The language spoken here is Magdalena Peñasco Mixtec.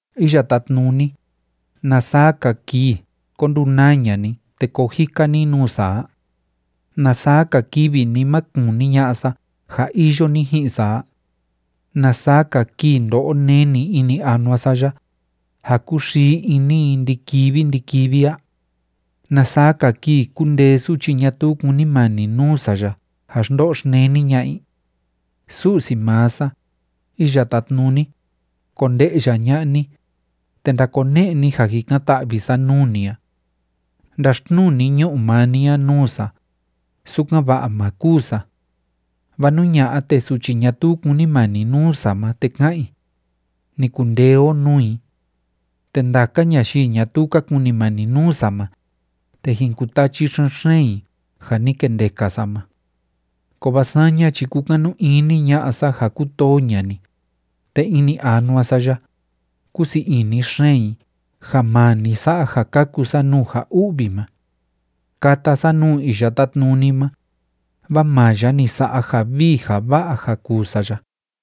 Iya Tátnuni, ¿na saa‑ka kii ko ndunaa ña'a ni te koo jika ni nuu sa a? ¿Na saa‑ka kivi ni ma kuni ña'a sa ja iyo ni ji'in sa a? ¿Na saa‑ka kii ndo'o neni ini anua sa ya, ja kúxii ini i ndi‑kivi ndi‑kivi a? ¿Na saa‑ka kii kundee suchi ñatuu kúnimani nuu sa ya ja xndo'o xneni ña'a i? Su'si maa sa, Iya Tátnuni, konde'ya ña'a ni, te ndakone'e ni ja jikan‑ta'vi sa nuu ni a. Ndaxtnuu ni ñu'u maa ni a nuu sa, sukan‑va'a má kûu sa. Vaa nú ña'a, te suchi ñatuu kúnimani nuu sa ma, te ka'an i, “Ni kundee o nuu i.” Te ndaka ñayii ñatuu ka kunimani nuu sa ma, te jin kutachi xen‑xeen i ja ni kendeka sa ma. Kovaa saña chi kúkanu ini ña'a sa ja kútoo ña'a ni, te ini anua sa ya, kúsii ini xeen i ja maa ni sa'a ja kaku sa nuu ja u'vi ma. Kata sa nuu Iya Tátnuni ma, vaa maa ya ni sa'a ja vii ja va'a ja kuu sa ya.